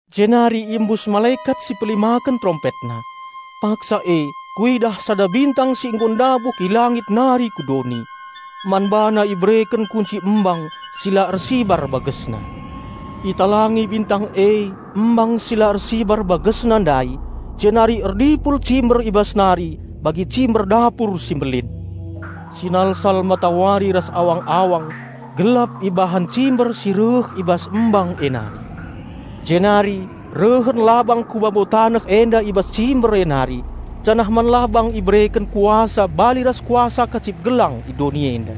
Jenari iembus malekat si pelimaken terompetna. Paksa e kuidah sada bintang si nggo ndabuh i langit nari ku doni. Man bana ibereken kunci embang si la ersibar bagesna. Italangi bintang e embang si la ersibar bagesna ndai jenari erdipul cimber i bas nari bagi cimber dapur si mbelin. Sinalsal matawari ras awang-awang gelap ibahan cimber si reh i bas embang e nari. Jenari rehen labang ku babo taneh enda i bas cimber e nari, janah man labang ibereken kuasa bali ras kuasa kacip gelang i doni enda.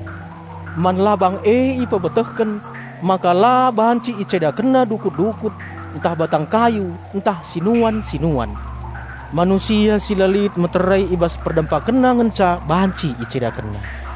Man labang e ipebetehken maka la banci icedakenna dukut-dukut, ntah batang kayu ntah sinuan-sinuan. Manusia si la lit meterai i bas perdempakenna ngenca banci icedakenna.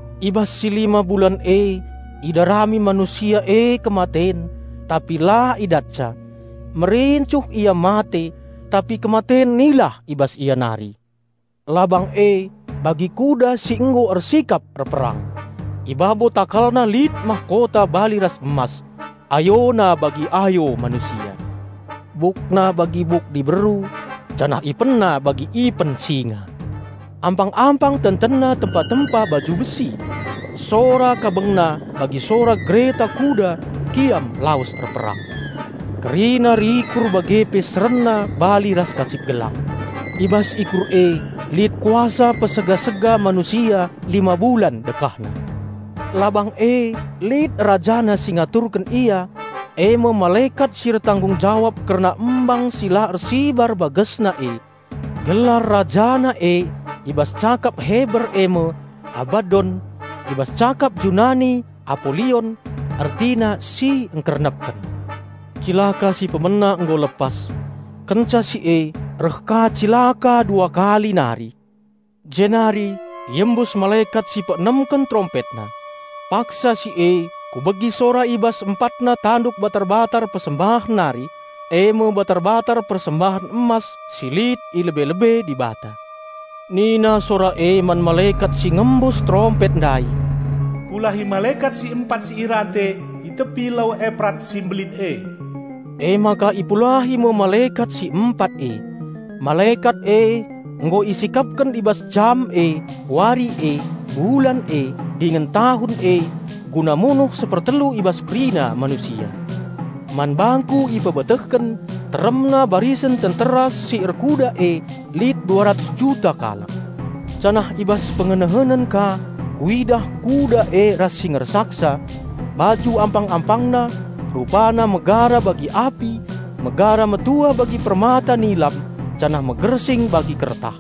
I bas si lima bulan e idarami manusia e kematen, tapi la idatca; merincuh ia mate, tapi kematen nilah i bas ia nari. Labang e bagi kuda si nggo ersikap erperang. I babo takalna lit mahkota bali ras emas. Ayona bagi ayo manusia. Bukna bagi buk diberu, janah ipenna bagi ipen singa. Ampang-ampang tentenna tempa-tempa baju besi. Sora kabengna bagi sora gereta kuda kiam lawes erperang. Kerina rikur bage pe serenna bali ras kacip-gelang. I bas ikur e lit kuasa niksa manusia lima bulan dekahna. Labang e lit rajana si ngaturken ia, e me malekat si ertanggung jawab kerna embang si la ersibar bagesna e. Gelar rajana e i bas cakap Heber e me Abaddon; i bas cakap Junani Apolion (ertina, si ngkernepken). Cilaka si pemena nggo lepas. Kenca si e reh ka cilaka dua kali nari. Jenari iembus malekat si peenemken terompetna. Paksa si e kubegi sora i bas empatna tanduk batar-batar persembahen nari, e me batar-batar persembahen emas si lit i lebe-lebe Dibata. Nina sora e man malekat si ngembus terompet ndai, "Pulahi malekat si empat si irante i tepi Lau Eprat si mbelin e." Emaka ipulahi me malekat si empat e. Malekat e nggo isikapken i bas jam e, wari e, bulan e, dingen tahun e guna munuh sepertelu i bas kerina manusia. Man bangku ipebetehken teremna barisen tentera si erkuda e lit dua ratus juta kalak. Janah i bas pengenehenen ka kuidah kuda e ras si ngersaksa: Baju ampang-ampangna, rupana megara bagi api, megara metua bagi permata nilam janah megersing bagi kertah.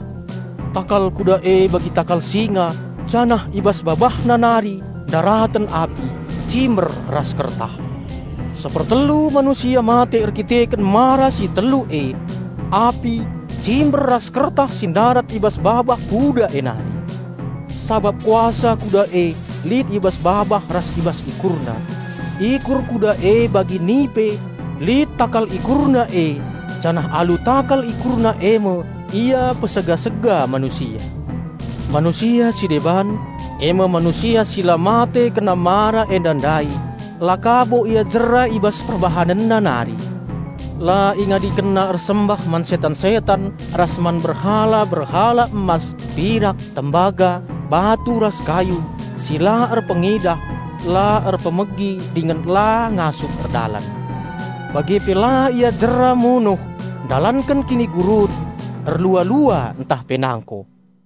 Takal kuda e bagi takal singa, janah i bas babahna nari ndaraten api, cimber ras kertah. Sepertelu manusia mate erkiteken mara si telu e; api, cimber ras kertah si ndarat i bas babah kuda e nari. Sabap kuasa kuda e lit i bas babah ras i bas ikurna. Ikur kuda e bagi nipe, lit takal ikurna e janah alu takal ikurna e me ia niksa manusia. Manusia si deban, e me manusia si la mate kena mara enda ndai la ka bo ia jera i bas perbahanenna nari. La ingadikenna ersembah man setan-setan ras man berhala-berhala emas, pirak, tembaga, batu ras kayu, si la erpengidah, la erpemegi dingen la ngasup erdalan. Bage pe la ia jera munuh, ndalanken kinigurun, erlua-lua ntah pe nangko.